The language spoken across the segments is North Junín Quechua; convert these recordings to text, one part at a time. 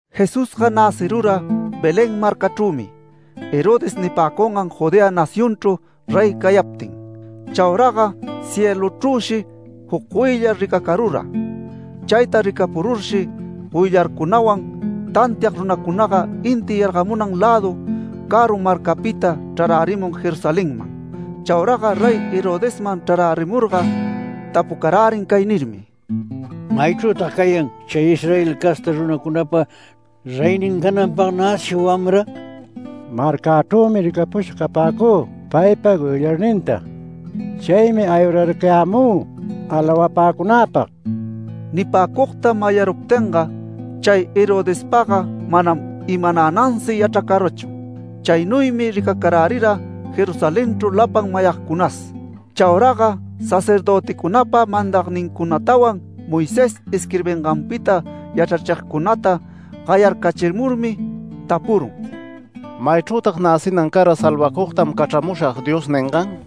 Jesusga näcirura Belén marcachrümi Herodes nipäcungan Judea nacionchru rey cayaptin. Chauraga cieluchrüshi juc goyllar ricacarura. Chayta ricapururshi goyllarcunawan tantiag runacunaga inti yargamunan lädu caru marcapita chrarärimun Jerusalenman. Chauraga Rey Herodesman chrarärimurga tapucarärin cay nirmi: “¿Maychrütag cayan chay Israel casta runacunapa reynin cananpag näcisha wamra? Marcäcunachrümi ricapusha capäcü paypa goyllarninta. Chaymi aywararcayämü alawapäcunäpag”. Nipäcugta mayaruptinga, chay Herodespaga manam imanänansi yachracarachu. Chaynuymi ricacarärira Jerusalenchru lapan mayagcunas. Chauraga sacerdöticunapa mandagnincunatawan Moisés isquirbinganpita yachrachigcunata gayarcachimurmi tapurun: “¿Maychrütag näcinan cara ‘Salvacugtam cachramushag’ Dios ningan?”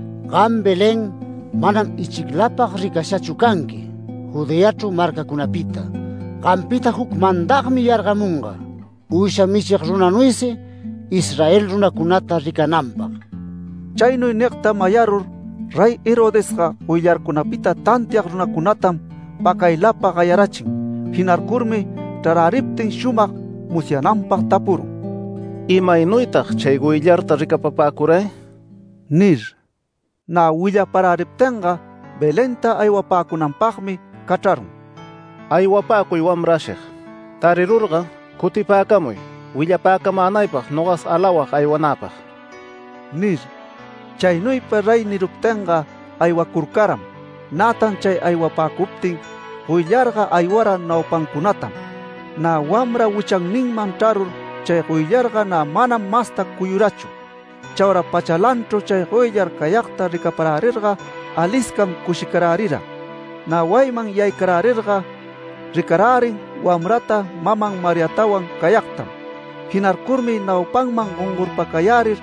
‘Gam Belén, manam ichiclapag ricashachu canqui Judeachru marcacunapita. Gampita juc mandagmi yargamunga uysha michig runanuysi Israel runacunata ricananpag’”. Chaynuy nigta mayarur Rey Herodesga goyllarcunapita tantiag runacunatam pacaylapa gayarachin. Jinarcurmi chraräriptin shumag musyananpag tapurun: “¿Imaynuytag chay goyllarta ricapapäcuray?” nir. Nä willaparäriptinga Belenta aywapäcunanpagmi cachrarun “Aywapäcuy wamra ashig. Tarirurga cutipäcamuy willapäcamänaypag nogas alawag aywanäpag” nir. Chaynuypa rey niruptinga aywacurcaram. Nätan chay aywapäcuptin goyllarga aywara naupancunatam. Nä wamra wichanninman chrarur chay goyllarga nä manam masta cuyurachu. Chaura pachalanchru chay goyllar cayagta ricaparärirga aliscam cushicarärira. Nä wayiman yaycarärirga ricarärin wamrata maman Mariatawan cayagtam. Jinarcurmi naupanman gongorpacayärir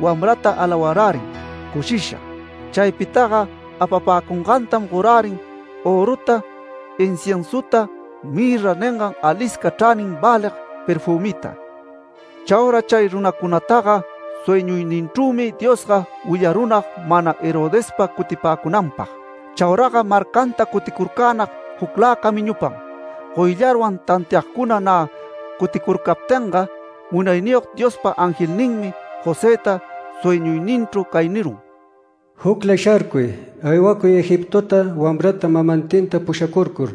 wamrata alawarärin cushisha. Chaypitaga apapäcungantam gorärin öruta, inciensuta, ‘mirra’ ningan alisca chranin välig perfümita. Chaura chay runacunataga sueñuyninchrümi Diosga willarunag mana Herodespa cutipäcunanpag. Chauraga marcanta cuticurcänag juclä camiñupam. Goyllarwan tantiagcuna nä cuticurcaptinga, Munayniyog Diospa angelninmi Josëta sueñuyninchru cay nirun: “¡Jucla sharcuy! Aywacuy Egiptota, wamrata mamantinta pushacurcur.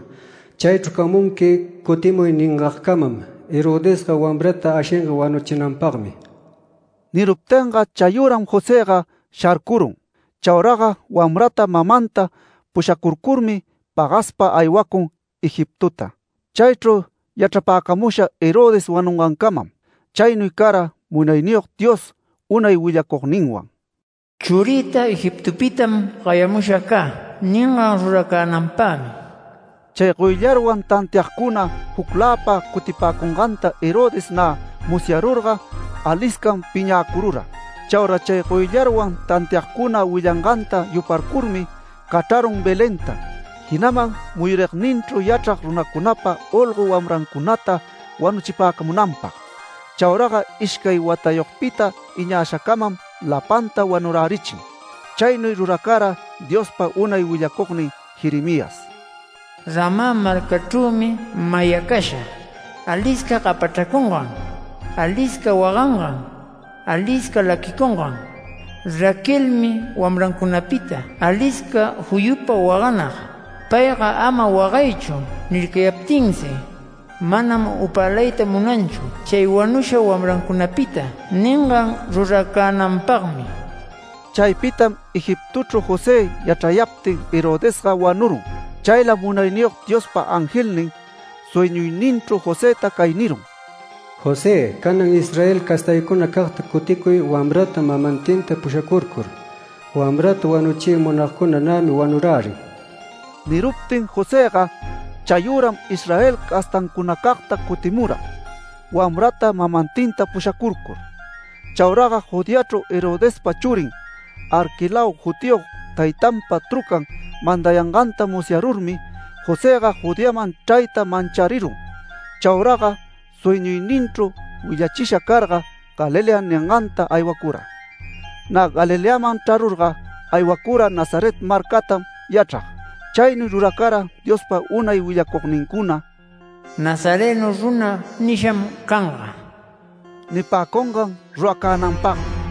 Chaychru camunqui cutimuy ningagcamam. Herodesga wamrata ashinga wanuchinanpagmi”. Niruptinga chayüram Josëga sharcurun. Chauraga wamrata mamanta pushacurcurmi pagaspa aywacun Egiptota. Chaychru yachrapäcamusha Herodes wanungancamam. Chaynuy cara Munayniyog Dios unay willacugninwan “Churïta Egiptopitam gayamusha cä” ningan ruracänanpagmi. Chay goyllarwan tantiagcuna jucläpa cutipäcunganta Herodes nä musyarurga aliscam piñäcurura. Chaura chay goyllarwan tantiagcuna willanganta yuparcurmi cachrarun Belenta, jinaman muyuragninchru yachrag runacunapa olgo wamrancunata wanuchipäcamunanpag. Chauraga ishcay watayogpita iñashacamam lapanta wanurärichin. Chaynuy ruracara Diospa unay willacugnin Jeremías “Ramá marcachrümi mayacasha alisca gapachracungan, alisca wagangan, alisca laquicungan. Raquelmi wamrancunapita alisca juyupa waganag. Payga ama wagaychu nircayaptinsi, manam upälayta munanchu chay wanusha wamrancunapita” ningan ruracänanpagmi. Chaypitam Egiptochru José yachrayaptin, Herodesga wanurun. Chaylam Munayniyog Diospa angelnin sueñuyninchru Josëta cay nirun: “José, canan Israel castaycunacagta cuticuy wamrata mamantinta pushacurcur. Wamrata wanuchiy munagcuna nämi wanurärin”. Niruptin Josëga chayüram Israel castancunacagta cutimura, wamrata mamantinta pushacurcur. Chaura Judeachru Herodespa churin ‘Arquelao’ jutiyog taytanpa trucan mandayanganta musyarurmi, Josëga Judeaman chrayta mancharirun. Chauraga sueñuyninchru willachisha carga ‘Galilea’ ninganta aywacura. Nä Galileaman chrarurga aywacura Nazaret marcatam yachrag. Chaynuy ruracara Diospa unay willacugnincuna “Nazareno runa nisham canga” nipäcungan ruracänanpagmi.